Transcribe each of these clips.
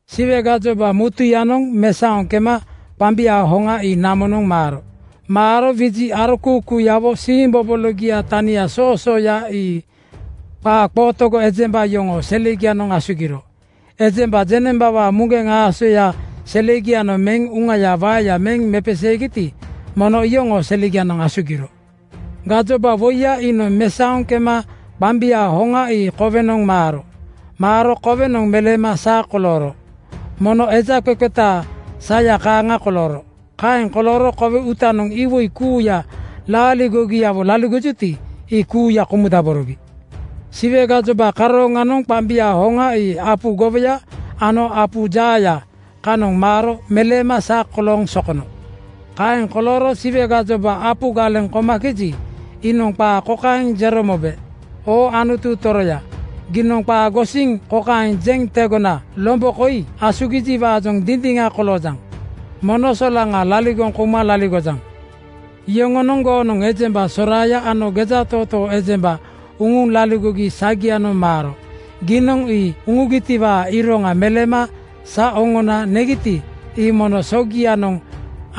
Siwe gajoba mutuyanoŋ mesaoŋ kema qambiaa hoŋa ii namonoŋ maaro. Maaro wiji arokuukuuyawo siimbobologia tania soosooya ii qaa qootogo ejemba yoŋoo selegianoŋ asugiro. Ejemba jeŋnembawaa muŋgeŋ aasoya selegianoŋ meŋ uŋayaa waeya meŋ mepeseegiti, mono iyoŋoo selegianoŋ asugiro. Gajoba woiya iinoŋ mesaoŋ kema qambiaa hoŋa ii kowenoŋ maaro. Maaro kowenoŋ meleema sa kolooro. Mono eja qeqetaa saya kaaŋa kolooro. Kaeŋ kolooro kowe uutanoŋ iwoi kuuya laaligogiawo laligojuti, ii kuuya komudaborogi. Siwe gajoba karooŋanoŋ qambiaa hoŋa ii apu gowoya ano apu jaaya kanoŋ maaro meleema sa kolooŋ sokono. Kaeŋ kolooro Siwe gajoba apu galeŋ komakeji, iinoŋ qaa kokaeŋ jero mobe, “Oo Anutu toroya, giinoŋ qaa gosiŋ kokaeŋ jeŋ tegona lombo koi asugijiwaajoŋ dindiŋa koloojaŋ. Mono solaŋa laligoŋ kouma laligojaŋ. Yoŋonoŋ goonoŋ ejemba soraaya ano gejatootoo ejemba uŋuŋ laligogi sagianoŋ maaro. Giinoŋ ii uŋugitiwaa iroŋa meleema sa oŋona negiti, ii mono sogianoŋ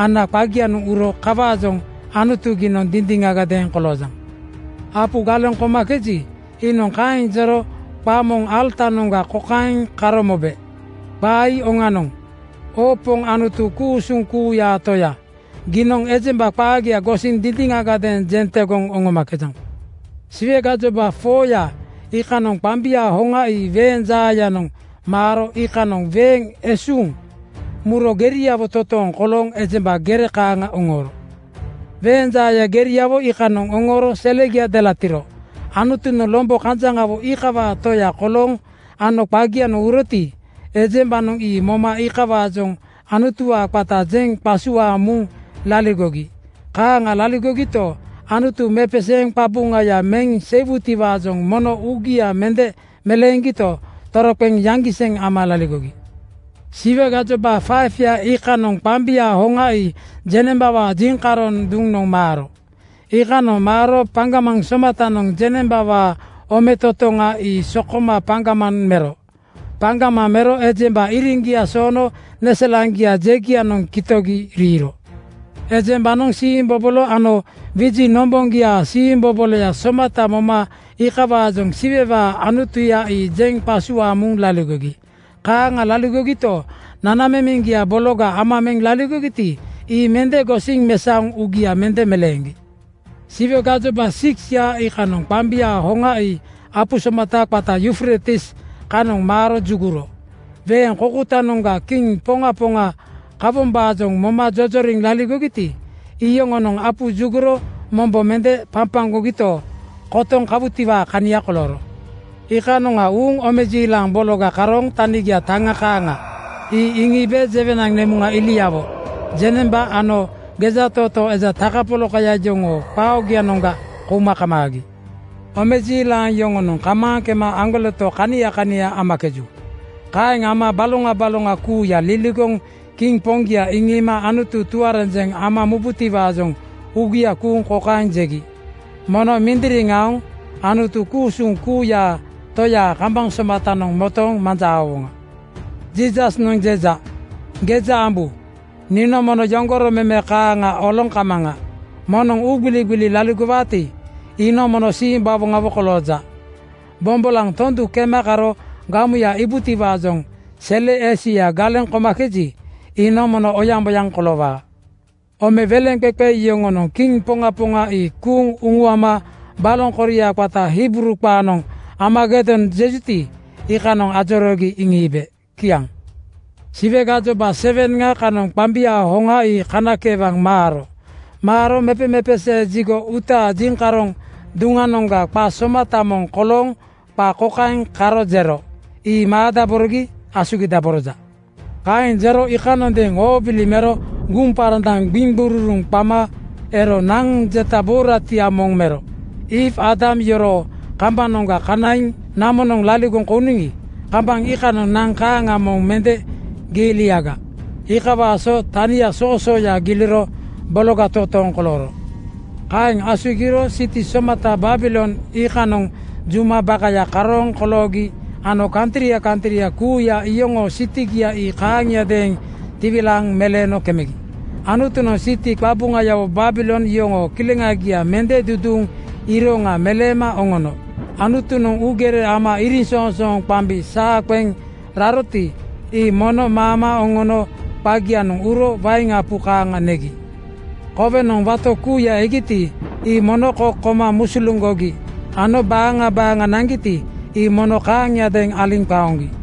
ana qagianoŋ uro. Kawaajoŋ Anutu giinoŋ dindiŋagadeeŋ koloojaŋ.” Apu galeŋ komakeji, iinoŋ kaeŋ jero qaa moŋ alatanoŋga kokaeŋ karo mobe, “Qaa ii oŋanoŋ! Oo Poŋ Anutu ku-usuŋ kuuyaa Toya, giinoŋ ejemba qaagia gosiŋ dindiŋagadeeŋ jeŋ tegoŋ oŋomakejaŋ.” Siwe gajoba 4:ya iikanoŋ qambiaa hoŋa ii weeŋ jaayanoŋ maaro iikanoŋ weeŋ esuŋ muro geriawo totooŋ kolooŋ ejemba gere kaaŋa oŋooro. Weeŋ jaaya geriawo iikanoŋ oŋooro selegia delatiro. Anutunoŋ lombo kanjaŋawo iikawaa Toya kolooŋ ano qagianoŋ uroti, ejembanoŋ ii moma iikawaajoŋ Anutuwaa qata jeŋ qasuaaŋ muŋ laligogi. Kaaŋa laligogito, Anutu mepeseeŋ qabuŋaya meŋ seiwutiwaajoŋ mono uugia mende meleeŋgito, toroqeŋ yaŋgiseŋ ama laligogi. Siwe gajoba 5:ya iikanoŋ qambiaa hoŋa ii jeŋnembawaa jiŋkaroŋ duŋnoŋ maaro. Iikanoŋ maaro paŋgamaŋ somatanoŋ jeŋnembawaa ometotoŋa (kingdom) ii sokoma paŋgamaŋ mero. Paŋgamaŋ mero ejemba iriŋgia soono neselaŋgia jegianoŋ kitogi riiro. Ejembanoŋ siimbobolo ano wiji nomboŋgiaa siimboboloya somata moma iikawaajoŋ Siwewaa Anutuya ii jeŋ qasuaaŋ muŋ laligogi. Kaaŋa laligogito, nanamemeŋgia bologa ama meŋ laligogiti, ii mende gosiŋ mesaoŋ uugia mende meleeŋgi. Siwe gajoba 6:ya iikanoŋ qambiaa hoŋa ii apu somata qata Yufreitis kanoŋ maaro juguro. Weeŋ koukoutanoŋga kiŋ poŋa poŋa kawombaajoŋ moma jojoriŋ laligogiti, iyoŋonoŋ apu juguro mombo mende papaŋgogito, kotoŋ kawutiwaa kania kolooro. Iikanoŋa uuŋ omejiilaŋ bologa karooŋ tanigia taŋa kaaŋa ii iŋiibe jewenaŋ nemuŋa iliawo, jeŋnemba ano gejatootoo eja takapolakaya yoŋoo qaa oogianoŋga kouma kamaagi. Omejiilaŋ yoŋonoŋ kamaaŋ kema aŋgoleto kania kania amakeju. Kaeŋ ama baloŋa baloŋa kuuya liligoŋ kiŋ poŋgia iŋiima Anutu tuarenjeŋ ambutiwaajoŋ uugia kuuŋ kokaeŋ jegi, “Mono mindiriŋ aoŋ Anutu ku-usuŋ kuuyaa Toyaa kambaŋ somatanoŋ motooŋ manja aowoŋa.” Jiisasnoŋ jeja, “Geja ambu! Niinoŋ mono yoŋgoro meme kaaŋa oloŋ kamaŋa. Moŋnoŋ uugbiligbili laligowaati, iinoŋ mono simbawoŋawo kolooja. Bombolaŋ tondu kema karo gamuya iibubotiwaajoŋ sele esuya galeŋ komakeji, iinoŋ mono oyaŋboyaŋ koloowaa.” Ome weleŋqeqe yoŋonoŋ kiŋ poŋa poŋa ii kuuŋ uŋuama baloŋ koria qata Hibruu qaanoŋ Armagedon jejuti, iikanoŋ ajoroogi iŋiibe. Kiaŋ. Siwe gajoba 7:ŋa kanoŋ qambiaa hoŋa ii kanakeewaŋ maaro. Maaro mepemepesee jigo (tempel) uutaa jiŋkaroŋ duŋanoŋga qa somata moŋ kolooŋ qaa kokaeŋ karo jero, “Ii maadaborogi asugidaboroja.” Kaeŋ jero iikanondeeŋ oobili mero guŋparandaŋ gbiŋgururuŋ qama ero naŋ jeta buuratia moŋ mero. Iiw (Eewa) Aadam yoroo kambanoŋga kanaiŋ namonoŋ laligoŋ kouniŋi, kambaŋ iikanoŋ naŋ kaaŋa moŋ mende giiliaga. Iikawaa so tania soosooya giliro bologa totooŋ kolooro. Kaeŋ asugiro siti somata Babilon iikanoŋ juma bakaya karooŋ koloogi ano kantria kantria kuuya iyoŋoo sitigia ii kaaŋiadeeŋ tiwilaaŋ meleeno kemegi. Anutunoŋ siti qabuŋayawo Babilon yoŋoo kileŋagia mende duduuŋ iroŋgia meleema oŋono. Anutunoŋ uugere ama iriŋsoŋsooŋanoŋ qambi saa qeŋ raroti, ii mono maama oŋono qagianoŋ uro wain apu kaaŋa negi. Kowenoŋ wato kuuya egiti, ii mono kok koma musuluŋgogi ano baaŋa baaŋa naŋgiti, ii mono kaaŋiadeeŋ aliŋ qaoŋgi.